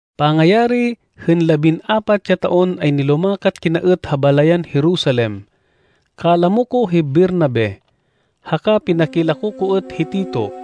Pangayari hên labin-apat ya taon ay nilumakat kina êt ha balayan Jerusalem. Kalamo ko hi Bernabe haka pinakilako ko êt hi Tito.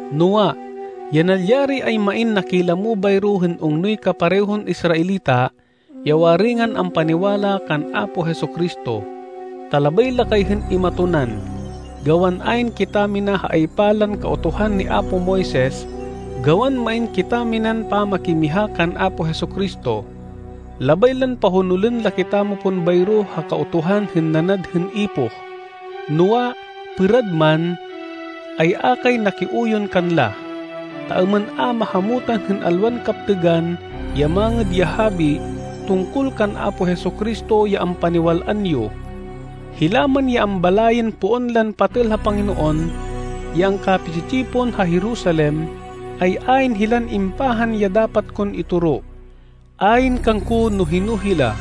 Noa, ya nalyari ay main nakilamo bayro hên ungnoy kaparehon Israelita ya waringan ampaniwala kan Apo Jesu-Cristo, ta labay la kay hên imatonan gawan ayn kitamina ha aypa lan Kautuhan ni apo Moises gawan main kitaminan pamakimiha kan Apo Jesu-Cristo. Labay lan pahonolên la kitamo pon bayro ha Kautuhan hên nanad hên ipoh. Noa, pêrad man, ay a kay nakiuyon kanla, ta êmên a mahamutan hên alwan kaptêgan ya Mangêd ya Habi tungkol kan Apo Jesu-Cristo, ya ampaniwal-an yo. Hila man ya ambalayên poon lan patêl ha Panginoon ya angkapi-tsi-tsipon ha Jerusalem, ay ayn hilan impahan ya dapat kon itoro. Ayn kangko no hino hila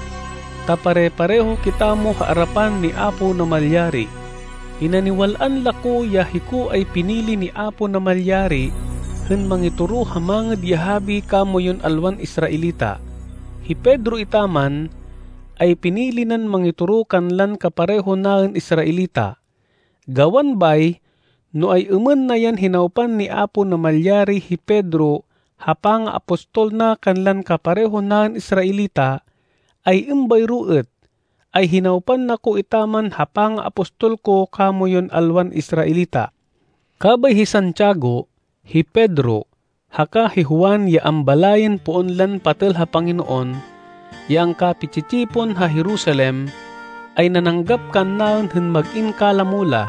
ta pare-pareho kitamo ha arapan ni Apo Namalyari. Pinaniwal-an la ko ya hiko ay pinili ni Apo Namalyari hên mangitoro hên Mangêd ya Habi kamoyun alwan Israelita. Hi Pedro etaman, ay pinili nan mangitoro kanlan kapareho naên Israelita. Gawan bay, no ay-êmên na yan hinawpan ni Apo Namalyari hi Pedro ha pangaapostol na kanlan kapareho naên Israelita, ay êmbayro êt, ay hinawpan na ko etaman ha pangaapostol ko kamoyun alwan Israelita. Kabay hi Santiago, hi Pedro, haka hi Juan ya ambalayên poon lan patêl ha Panginoon ya angkapi-tsi-tsipon ha Jerusalem, ay nananggap kannaên hên mag-in kalamo la,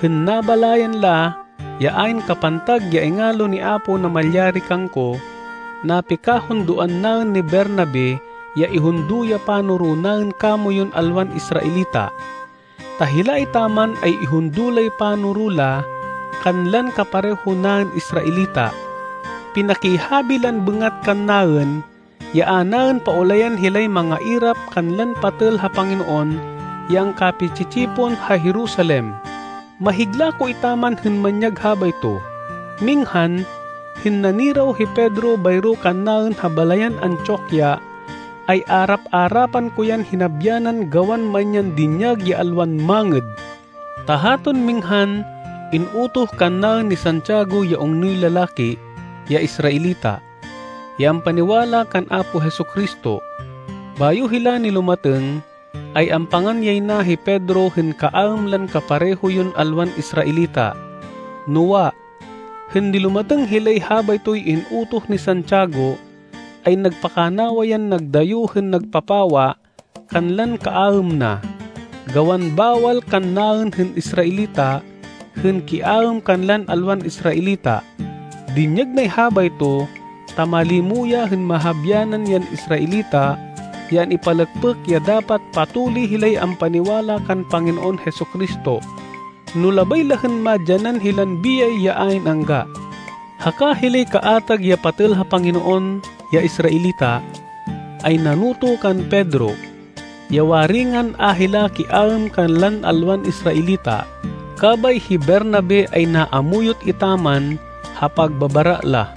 hên nabalayan la ya ayn kapantag ya ingalo ni Apo Namalyari kangko. Napikahundoan naên ni Bernabe ya ihundo ya panoro naên kamoyun alwan Israelita, ta hila etaman ay ihundo lay panoro la kanlan kapareho naên Israelita. Pinakihabi lan bêngat kannaên ya a naên paulayan hilay mangairap kanlan patêl ha Panginoon ya angkapi-tsi-tsipon ha Jerusalem. Mahigla ko etaman hên manyag habayto. Minghan, hên naniraw hi Pedro bayro kannaên ha balayan Antioquia, ay arap-arapan ko yan hinabyanan gawan main yan dinyag ya alwan mangêd. Ta haton minghan in-utoh kannaên ni Santiago ya ungnoy lalaki, ya Israelita, ya ampaniwala kan Apo Jesu-Cristo. Bayo hila nilumatêng ay ampangan yay na hi Pedro hên kaaêm lan kapareho yon alwan Israelita. Noa, hên nilumatêng hilay habaytoy in-utoh ni Santiago ay nagpakanawa yan nagdayo hên nagpapawa kanlan kaaêm na, gawan bawal kannaên hên Israelita, hên kiaêm kanlan alwan Israelita. Dinyag nay habayto ta malimo ya hên mahabyanan yan Israelita ya an-ipalêkpêk ya dapat patuli hilay ampaniwala kan Panginoon Jesu-Cristo, no labay la hên madyanan hilan biyay ya ayn angga. Haka hilay kaatag ya patêl ha Panginoon ya Israelita, ay nanoto kan Pedro, ya waringan a hila kiaêm kanlan alwan Israelita, kabay hi Bernabe ay naamuyot etaman ha pagbabara la.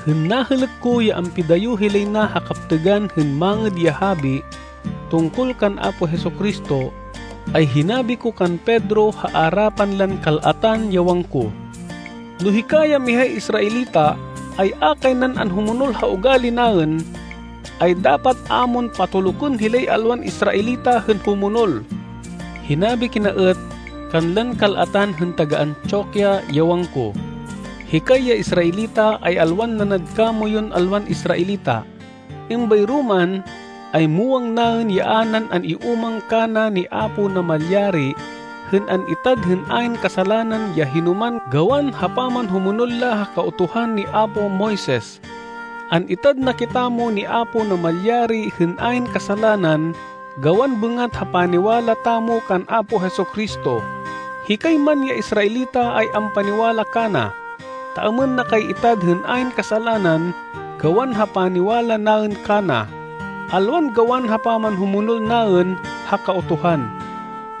Hên nahêlêk ko ya ampidayo hilay na ha kaptêgan hên Mangêd ya Habi tungkol kan Apo Jesu-Cristo, ay hinabi ko kan Pedro ha arapan lan kal-atan, ya wangko, “No hika, ya mihay Israelita, ay a kay nan anhumonol ha ugali naên, ay dapat a mon patolukên hilay alwan Israelita hên humonol.” Hinabi kina êt kanlan kal-atan hên taga-Antioquia, ya wangko, “Hikay ya Israelita, ay alwan nanad kamoyun alwan Israelita. Êmbayro man, ay muwang naên ya a nan an-iúmang kana ni Apo Namalyari hên an-itad hên ayn kasalanan ya hinoman gawan ha pamanhumonol la ha Kautuhan ni apo Moises. An-itad na kitamo ni Apo Namalyari hên ayn kasalanan gawan bêngat ha paniwala tamo kan Apo Jesu-Cristo. Hikay man ya Israelita ay ampaniwala kana, ta êmên na kay itad hên ayn kasalanan gawan ha paniwala naên kana, alwan gawan ha pamanhumonol naên ha Kautuhan.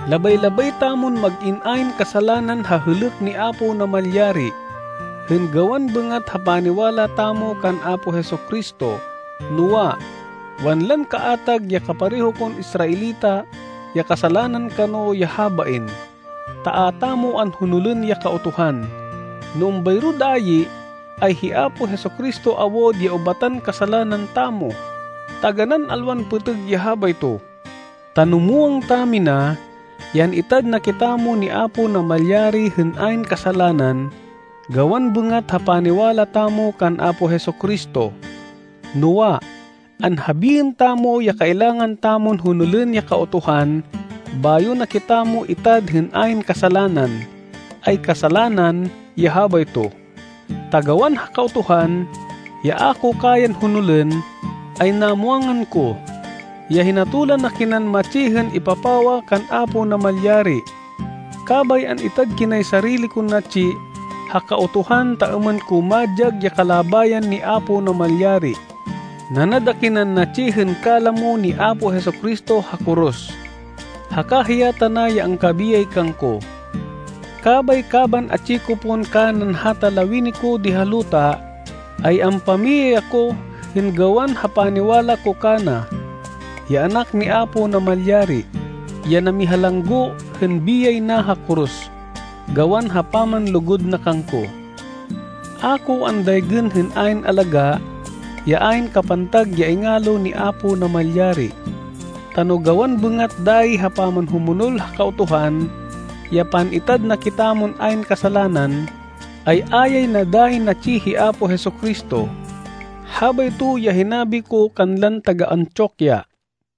“Labay-labay tamon mag-in ayn kasalanan ha hêlêk ni Apo Namalyari, hên gawan bêngat ha paniwala tamo kan Apo Jesu-Cristo, noa, wanlan kaatag ya kapareho kon Israelita ya kasalanan kano ya habain, ta a tamo anhonolên ya Kautuhan. No êmbayro dayi, ay hi Apo Jesu-Cristo awud ya ubatan kasalanan tamo. Taganán alwan pêtêg ya habayto. Ta no muwang tamina ya an-itad na kitamo ni Apo Namalyari hên ayn kasalanan gawan bêngat ha paniwala tamo kan Apo Jesu-Cristo, noa, anhabiên tamo ya kailangan tamon honolên ya Kautuhan bayo na kitamo itad hên ayn kasalanan, ay kasalanan ya habayto. Ta gawan ha Kautuhan, ya a ko kayan honolên, ay namwangan ko, ya hinatolan akinan matsi hên ipapawa kan Apo Namalyari, kabay an-itad kinay sarili kon natsi ha Kautuhan ta êmên ko madyag ya kalabayan ni Apo Namalyari. Nanad akinan natsi hên kalamo ni Apo Jesu-Cristo ha koros, haka hiya tana ya angkabiyay kangko. Kabay, kaban atsi ko pon kanan hata lawini ko di ha luta, ay ampamiyay ako hên gawan ha paniwala ko kana, ya Anak ni Apo Namalyari, ya namihalanggo hên biyay na ha koros gawan ha pamanlugud na kangko. A ko andaygên hên ayn alagá ya ayn kapantag ya ingalo ni Apo Namalyari. Ta no gawan bêngat dayi ha pamanhumonol ha Kautuhan ya pan-itad na kitamon ayn kasalanan, ay a yay na dayi natsi hi Apo Jesu-Cristo.” Habayto ya hinabi ko kanlan taga-Antioquia.